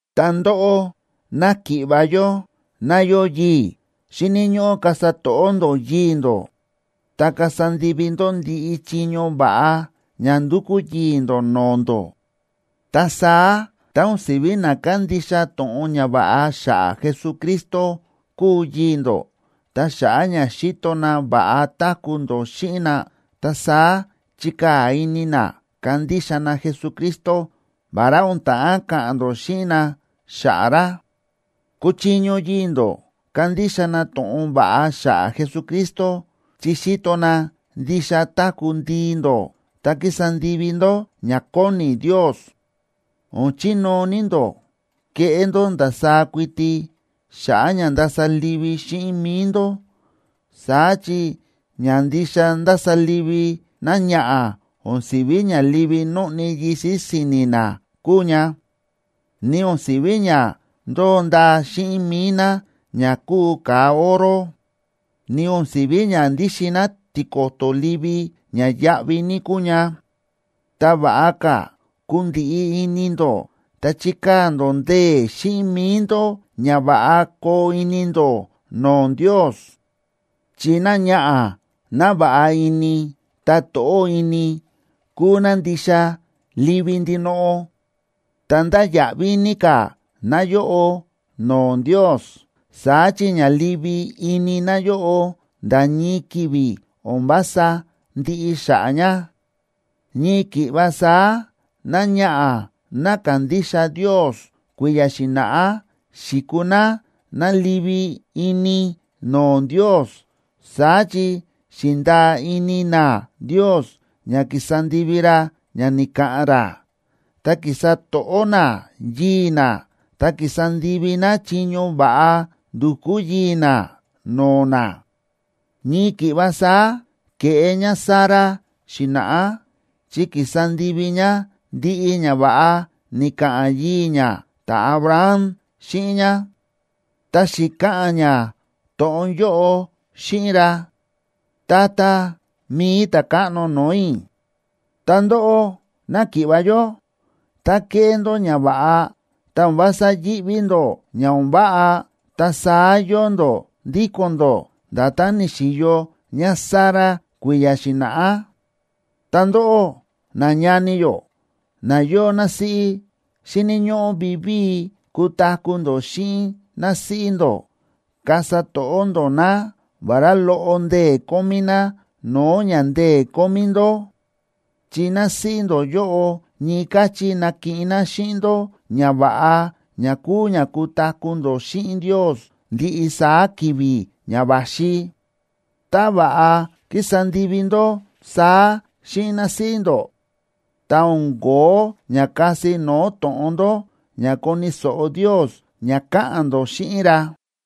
Ta ndóꞌó, náki̱ꞌva̱ yó ná yóo yii̱, xíni̱ ñóꞌó kasa to̱ꞌó ndó yii̱ ndó, ta kasa ndivi ndó ndiꞌi chiño va̱ꞌa ña ndúkú yii̱ ndó no̱o̱ ndó. Ta saá, tá o̱n si̱ví na kándixa to̱ꞌon ñava̱ꞌa xa̱ꞌa̱ Jesucristo kúu yii̱ ndó, ta xa̱ꞌa̱ ña xíto na va̱ꞌa táku̱ ndó xíꞌin na, ta saá chikaa̱ ini na kandixa na Jesucristo, vará o̱n ta̱ꞌán ka̱ꞌa̱n ndó xíꞌin na xa̱ꞌa̱ ra. Kuchiño yii̱ ndó kandixa na to̱ꞌon va̱ꞌa xa̱ꞌa̱ Jesucristo chi xíto na ndixa táku̱ ndii ndó, ta kísa ndivi ndó ña kóni Ndios. O̱n chinóo ní ndó keꞌé ndó ndasaá kuiti xa̱ꞌa̱ ña ndasa livi xíꞌin mi̱i ndó. Saá chi ña ndixa ndása livi náñaꞌa̱ o̱n si̱ví ña livi nóꞌni yisi̱ si̱ni̱ ná kúu ña, ni o̱n si̱ví ña ndóo ndaa xíꞌin mi̱i ná ña kúu ka̱a oro, ni o̱n si̱ví ña ndíxin ná tiko̱to̱ livi ña yáꞌví ní kúu ña. Ta va̱ꞌa ka̱ kundiꞌi ini ndó, ta chikaa̱ ndó ndee̱ xíꞌin mi̱i ndó ña va̱ꞌa koo ini ndó no̱o̱ Ndios. Chi náñaꞌa̱ ná va̱ꞌa ini ta to̱ꞌó ini kúu ná ndixa livi ndinoꞌo ta ndáya̱ꞌví ní ka̱ náyóꞌo no̱o̱ Ndios. Saá chi ña livi ini náyóꞌo nda̱ ñii ki̱vi̱ o̱n vása ndiꞌi xa̱ꞌa̱ ña. Ñii ki̱ꞌva saá náñaꞌa̱ ná ka̱ndixa Ndios kui̱ya̱ xi̱na̱ꞌá xi̱kuu ná ná livi ini no̱o̱ Ndios. Saá chi xi̱ndaa ini ná Ndios ña kísa ndivi ra ña ni̱ka̱ꞌa̱n ra, ta ki̱sa to̱ꞌó ná yii̱ ná ta ki̱sa ndivi ná chiño va̱ꞌa ndu̱kú yii̱ ná no̱o̱ ná. Ñii ki̱ꞌva saá ke̱ꞌé ñáSara xi̱na̱ꞌá, chi ki̱sa ndivi ñá ndiꞌi ñava̱ꞌa ni̱ka̱ꞌa̱n yii̱ ñá ta̱Abraham xíꞌin ñá, ta xi̱ka̱ꞌa̱n ñá to̱ꞌon yóꞌo xíꞌin ra: “Tata, mi̱i ta̱káꞌno no̱o̱ i̱.” Ta ndóꞌó náki̱ꞌva̱ yó, tá kéꞌé ndó ñava̱ꞌa ta o̱n vása yíꞌví ndó ña o̱n váꞌa, ta saá yóo ndó ndíko̱n ndó nda̱tán ni̱xi̱yo ñáSara kui̱ya̱ xi̱na̱ꞌá. Ta ndóꞌó, nañani yó na yóo násíꞌí, xíni̱ ñóꞌó vivíi kutaku̱ ndó xíꞌin násíꞌí ndó. Kasa to̱ꞌó ndó ná, vará loꞌo ndee̱ kómí ná no̱o̱ ña ndee̱ kómí ndó, chi násíꞌí ndó yóꞌo ñii káchí nakiꞌin ná xíꞌin ndó ñava̱ꞌa ña kúu ña kutaku̱ ndó xíꞌin Ndios ndiꞌi saá ki̱vi̱ ña va̱xi. Tá va̱ꞌa kísa ndivi ndó saá xíꞌin násíꞌí ndó, ta o̱n kóo ña kasi no̱o̱ to̱ꞌon ndó, ña koni̱ so̱ꞌo Ndios ña káꞌa̱n ndó xíꞌin ra.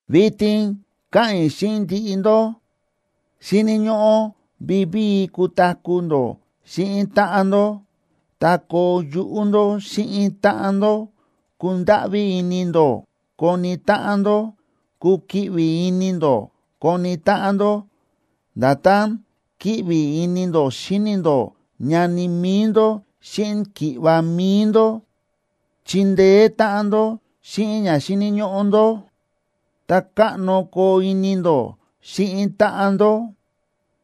Vitin káꞌa̱n i̱ xíꞌin ndiꞌi ndó. Xíni̱ ñóꞌó vivíi kutaku̱ ndó xíꞌin táꞌan ndó ta koo yuꞌú ndó xíꞌin táꞌan ndó; kundáꞌví ini ndó koni táꞌan ndó; kukiꞌvi ini ndó koni táꞌan ndó nda̱tán kíꞌvi ini ndó xíni ndó ñani mi̱i ndó xíꞌin ki̱ꞌva̱ mi̱i ndó. Chindeé táꞌan ndó xíꞌin ña xíni̱ ñóꞌó ndó; ta káꞌno koo ini ndó xíꞌin táꞌan ndó.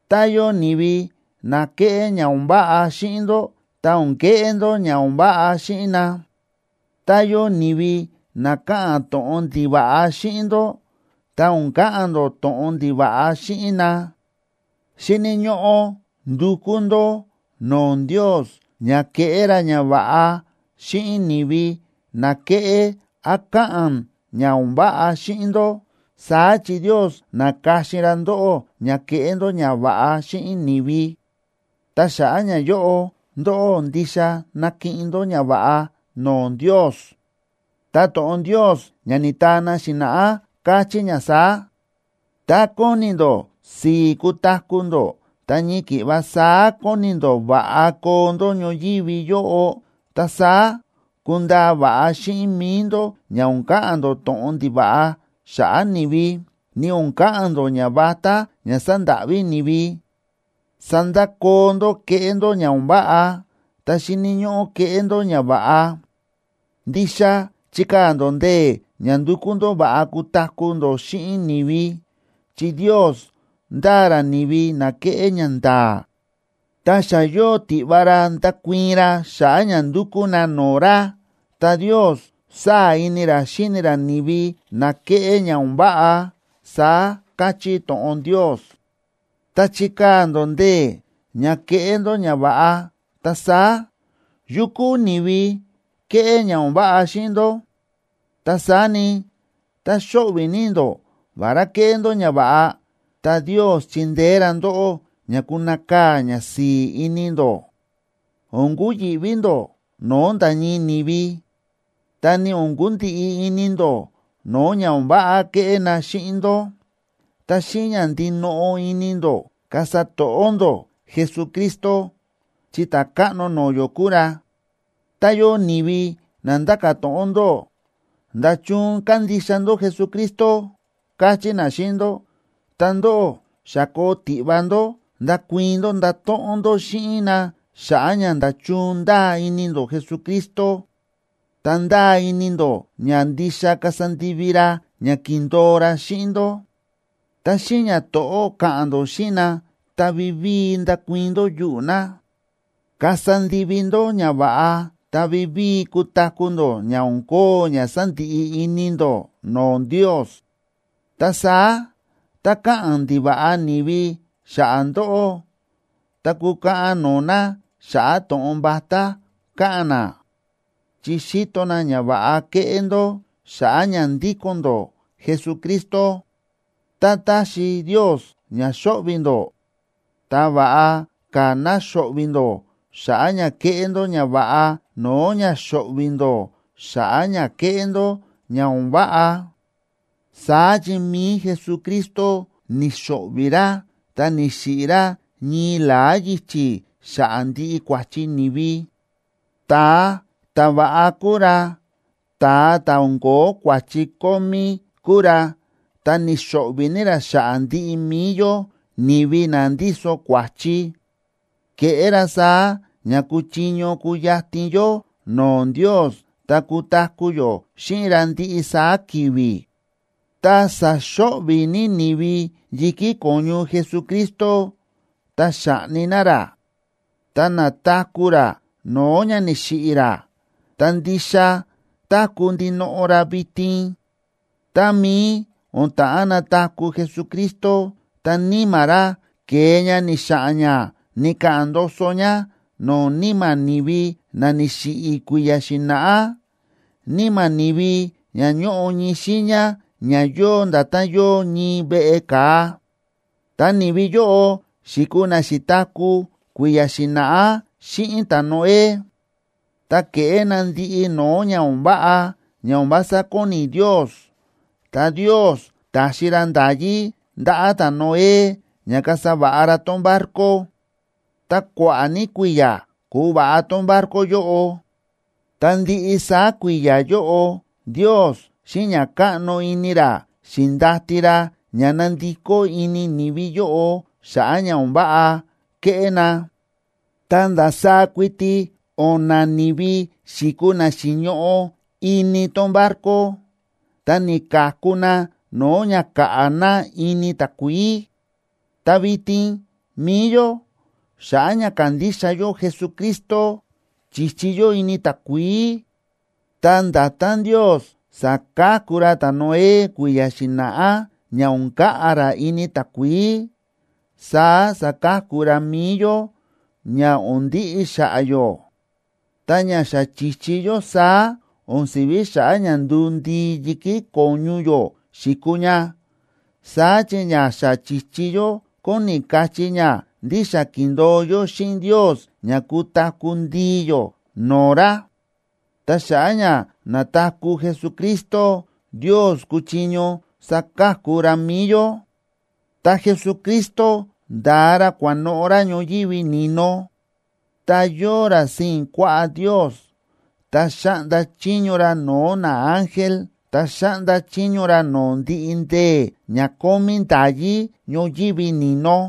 Tá yóo ni̱vi na kéꞌé ña o̱n váꞌa xíꞌin ndó, ta o̱n keꞌé ndó ña o̱n váꞌa xíꞌin na. Tá yóo ni̱vi na káꞌa̱n to̱ꞌon ndiva̱ꞌa xíꞌin ndó, ta o̱n ka̱ꞌa̱n ndó to̱ꞌon ndiva̱ꞌa xíꞌin na. Xíni̱ ñóꞌó ndukú ndó no̱o̱ Ndios ña keꞌé ra ñava̱ꞌa xíꞌin ni̱vi na kéꞌé án káꞌa̱n ña o̱n váꞌa xíꞌin ndó, saá chi Ndios na̱ka̱xin ra ndóꞌó ña keꞌé ndó ñava̱ꞌa xíꞌin ni̱vi. Ta xa̱ꞌa̱ ñayóꞌo ndóꞌó ndixa nakiꞌin ndó ñava̱ꞌa no̱o̱ Ndios. Ta to̱ꞌon Ndios ña ni̱taa na xi̱na̱ꞌá, káchí ña saá: Tá kóni ndó si̱i̱ kutaku̱ ndó, ta ñii ki̱ꞌva saá kóni ndó va̱ꞌa koo ndó ñoyívi yóꞌo, ta saá kundaa va̱ꞌa xíꞌin mi̱i ndó ña o̱n ka̱ꞌa̱n ndó to̱ꞌon ndiva̱ꞌa xa̱ꞌa̱ ni̱vi, ni o̱n ka̱ꞌa̱n ndó ñavatá ña sandáꞌví ni̱vi. Sandakoo ndó kéꞌé ndó ña o̱n váꞌa, ta xíni̱ ñóꞌó keꞌé ndó ñava̱ꞌa. Ndixa chikaa̱ ndó ndee̱ ña ndukú ndó va̱ꞌa kutaku̱ ndó xíꞌin ni̱vi. Chi Ndios ndáa ra ni̱vi na kéꞌé ñanda̱a̱, ta xa yóo tiꞌva ra ndakuii̱n ra xa̱ꞌa̱ ña ndukú na no̱o̱ ra, ta Ndios sáa̱ ini ra xíni ra ni̱vi na kéꞌé ña o̱n váꞌa, saá káchí to̱ꞌon Ndios. Tá chíkaa̱ ndó ndee̱ ña keꞌé ndó ñava̱ꞌa, ta saá, ¿yu kúu ni̱vi keꞌé ña o̱n váꞌa xíꞌin ndó? Ta saá ni, tá xóꞌvi̱ ní ndó vará kéꞌé ndó ñava̱ꞌa, ta Ndios chindeé ra ndóꞌó ña kunakaa̱ ñasi̱i̱ ini ndó. O̱n kuyi̱ꞌví ndó no̱o̱ nda̱ ñii ni̱vi, ta ni o̱n kundiꞌi ini ndó no̱o̱ ña o̱n váꞌa keꞌé na xíꞌin ndó. Ta xíꞌin ña ndinoꞌo ini ndó kasa to̱ꞌó ndó Jesucristo, chi Ta̱káꞌno no̱o̱ yó kúu ra. Tá yóo ni̱vi na nda̱ka̱ to̱ꞌon ndóꞌó: “¿Nda̱chun kándixa ndó Jesucristo?”, kachí na xíꞌin ndó, ta ndóꞌó xa koo tiꞌva ndó ndakuii̱n ndó ndato̱ꞌon ndó xíꞌin na xa̱ꞌa̱ ña nda̱chun ndáa ini ndó Jesucristo, ta ndáa ini ndó ña ndixa kasa ndivi ra ña ki̱ndo̱o ra xíꞌin ndó, ta xíꞌin ñato̱ꞌó ka̱ꞌa̱n ndó xíꞌin na ta vivíi ndakuii̱n ndó yuꞌu̱ na. Kasa ndivi ndó ñava̱ꞌa ta vivíi kutaku̱ ndó ña o̱n kóo ña sandiꞌi ini ndó no̱o̱ Ndios. Ta saá, tá káꞌa̱n ndiva̱ꞌa ni̱vi xa̱ꞌa̱ ndóꞌó, ta kukaꞌan no̱o̱ na xa̱ꞌa̱ to̱ꞌon vatá káꞌa̱n na, chi xíto na ñava̱ꞌa kéꞌé ndó xa̱ꞌa̱ ña ndíko̱n ndó Jesucristo. Tá taxi Ndios ña xo̱ꞌvi̱ ndó, ta va̱ꞌa ka̱ ná xo̱ꞌvi̱ ndó xa̱ꞌa̱ ña kéꞌé ndó ñava̱ꞌa no̱o̱ ña xo̱ꞌvi̱ ndó xa̱ꞌa̱ ña kéꞌé ndó ña o̱n váꞌa. Saá chi mi̱i Jesucristo ni̱xo̱ꞌvi̱ ra ta ni̱xiꞌi̱ ra ñii la̱á yichi̱ xa̱ꞌa̱ ndiꞌi kua̱chi ni̱vi. Ta̱a ta̱va̱ꞌa kúu ra, ta̱a ta̱ o̱n ko̱ó kua̱chi kómí kúu ra, ta ni̱xo̱ꞌvi̱ ní ra xa̱ꞌa̱ ndiꞌi mi̱i yó ni̱vi na ndíso kua̱chi; ke̱ꞌé ra saá ña kuchiño kuyatin yó no̱o̱ Ndios ta kutaku̱ yó xíꞌin ra ndiꞌi saá ki̱vi̱. Tá sa̱xo̱ꞌvi̱ ní ni̱vi yi̱kí ko̱ñu Jesucristo ta xa̱ꞌni na ra, ta na̱taku̱ ra no̱o̱ ña ni̱xiꞌi̱ ra, ta ndixa táku̱ ndinoꞌo ra vitin. Tá mií o̱n ta̱ꞌán nataku̱ Jesucristo, ta Níma̱ ra ke̱e ña ni̱xa̱ꞌa̱n ña ni̱ka̱ꞌa̱n ndoso ña no̱o̱ níma̱ ni̱vi na ni̱xiꞌi̱ kui̱ya̱ xi̱na̱ꞌá, níma̱ ni̱vi ña ñóꞌo ñii xiiña ña yóo nda̱tán yóo ñii veꞌe ka̱a. Ta ni̱vi yóꞌo xi̱kuu na xi̱taku̱ kui̱ya̱ xi̱na̱ꞌá xíꞌin ta̱Noé, ta ke̱ꞌé na ndiꞌi no̱o̱ ña o̱n váꞌa ña o̱n vása kóni Ndios. Ta Ndios ta̱xi ra nda̱yí ndaꞌa̱ ta̱Noé ña kasa va̱ꞌa ra tón barco, ta kua̱ꞌa̱ ní kui̱ya̱ kúva̱ꞌa tón barco yóꞌo, ta ndiꞌi saá kui̱ya̱ yóꞌo Ndios xíꞌin ña káꞌno ini ra xi̱ndati ra ña nandikó ini ni̱vi yóꞌo xa̱ꞌa̱ ña o̱n váꞌa kéꞌé na. Ta ndasaá kuiti o̱na̱ ni̱vi xi̱kuu na xi̱ñoꞌo ini tón barco, ta ni̱ka̱ku na no̱o̱ ña ka̱ꞌa̱ na ini takuií. Ta vitin mi̱i yó, xa̱ꞌa̱ ña kándixa yó Jesucristo, chíchi yó ini takuií, ta nda̱tán Ndios sa̱ka̱ku ra ta̱Noé kui̱ya̱ xi̱na̱ꞌá ña o̱n ka̱ꞌa̱ ra ini takuií, saá saka̱ku ra mi̱i yó ña o̱n ndiꞌi xa̱ꞌa̱ yó. Ta ña xa chi̱chi yó saá, o̱n si̱ví xa̱ꞌa̱ ña nduu ndii yi̱kí ko̱ñu yó xi̱kuu ña. Saá chi ña xa chi̱chi yó kóni kachí ña ndí xa ki̱ndo̱o yó xíꞌin Ndios ña kutaku̱ ndii yó no̱o̱ ra. Ta xa̱ꞌa̱ ña na̱taku̱ Jesucristo, Ndios kúchiño saka̱ku ra mi̱i yó. Ta Jesucristo nda̱a ra kua̱noꞌo̱ ra ñoyívi ni̱no, ta yóo ra sii̱n kuaꞌá Ndios, ta xáꞌnda chiño ra no̱o̱ naángel ta xáꞌnda chiño ra no̱o̱ ndiꞌi ndee̱ ña kómí nda̱yí ñoyívi ni̱no.